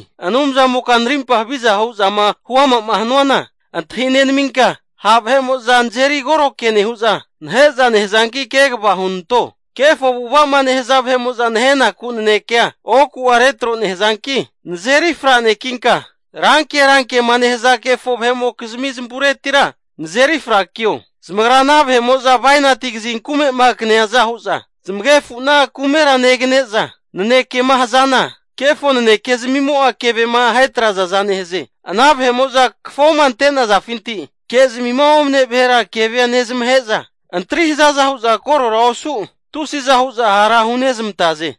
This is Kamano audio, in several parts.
Anumzamoka narimpa havizama hu'zama huama'ma hanuana antahi nenaminka, ha' vahe'mo'za nazeri koro ke nehu'za, nahe'za nehazanki kegava hunanto. Kefo avu'ava'ma nehaza vahe'mo'za nahenaku nanekea oku'a retro nehazanki, nazeri franekinka, ranke rankema nehaza kefo vahe'mokizmi zamavureti nazeri frakio. Zamagra ana vahe'mo'za bainati kazin kume'ma kaneaza hu'za, zamagefu'na kumera negane'za, nanekema hazana, kefo nanekezmimo'a kevema ahetrazaza nehaze. Ana vahe'mo'za kafoma ante'nazafinti kezmima omane vahera kevea nezmahe'za, antri hazaza hu'za korora osu tusiza hu'za hara hunezmantaze.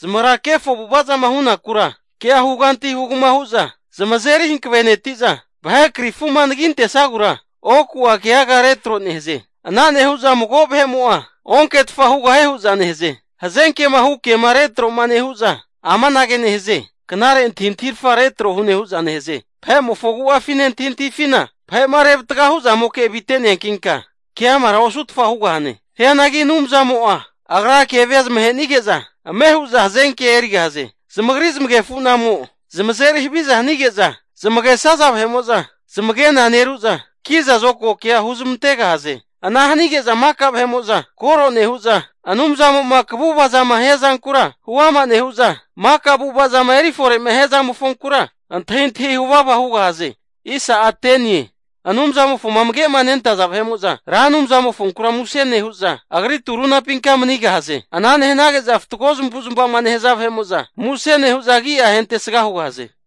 Zamagra kefo avu'avazama hunakura kea huganti hugama hu'za zamazeri hankaveneti'za, vahe krifuma anagintesagura oku'a keaga retro nehaze. Ana nehu'za mago vahe'mo'a onketfa hugahie hu'za nehaze. Hazenkema hu' kema retroma nehu'za amanage nehaze, knare antahintahirafa retro hune hu'za nehaze. Vahe'mofo agu'afine antahintahifina vahe'ma revatga huzamoke avite'neankinka keamara osutfa hugahane. Hianagi Anumzamo'a Agra kevea zamahe'nige'za, ame hu'za hazenkea erigahaze. Zamagri zamagefu'namo zamazeri haviza hanige'za, zamagesaza vahe'mo'za zamagena neru'za, kiza zokago kea huzmantegahaze. Ana hanige'za maka vahe'mo'za koro nehu'za, Anumzamo'ma kaguvazama hia zankura huama nehu'za, maka avu'avazama eri fore'ma hia zamofonkura antahintahia huvava hugahaze. Anumzamofoma amage'ma nentaza vahe'mo'za Ra Anumzamofonkura muse nehu'za, Agri turunapinka manigahaze. Ana nehanage'za fatgo zamavuzmava'ma nehaza vahe'mo'za, muse nehu'za agi'a ahentesga hugahaze.